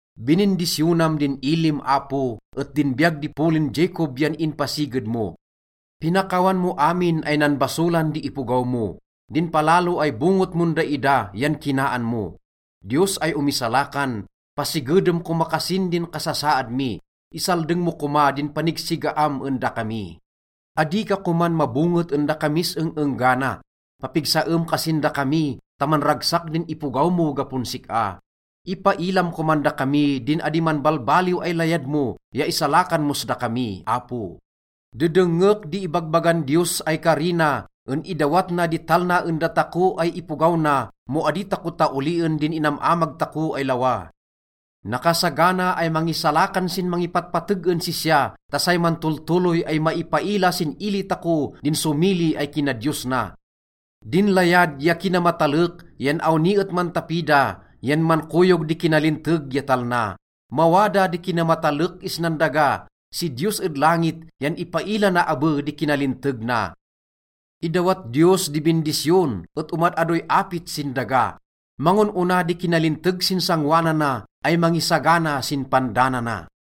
Binindisyonam din ilim, Apo, et din biyag di polin Jacob yan inpasiged mo. Pinakawan mo amin ay nanbasolan di ipogaw mo, din palalo ay bonget mon daida yan kinaan mo. Diyos ay omisalakan, pasigedem koma kasin din kasasaad mi, isaldeng mo koma din panigsigaam en dakami. Adi ka koman mabonget en dakamis eng-enggana. Papigsaem kasin dakami ta manragsak din ipogaw mo gapon sik-a. Ipailam koman dakami din adi manbalbaliw ay layad mo ya isalakan mos dakami, Apo. Dedengngek di ibagbagan Diyos ay kari na en idawat na di talna en datako ay ipogaw na mo adi tako taolien din inam-amag tako ay lawa. Nakasagana ay mangisalakan sin mangipatpateg en sisya, ta say mantoltoloy ay maipaila sin ili tako din somili ay kinadiyos na. Din layad ya kinamatalek yan awni et mantapi da, yan mankoyog di kinalinteg ya talna. Mawada di kinamatalek isnan daga, si Diyos ed langit yan ipaila na abe di kinalinteg na. Idawat Diyos di bindisyon et omad-adoy apit sin daga. Mangon-ona di kinalinteg sin sangoanana ay mangisagana sin pandanana.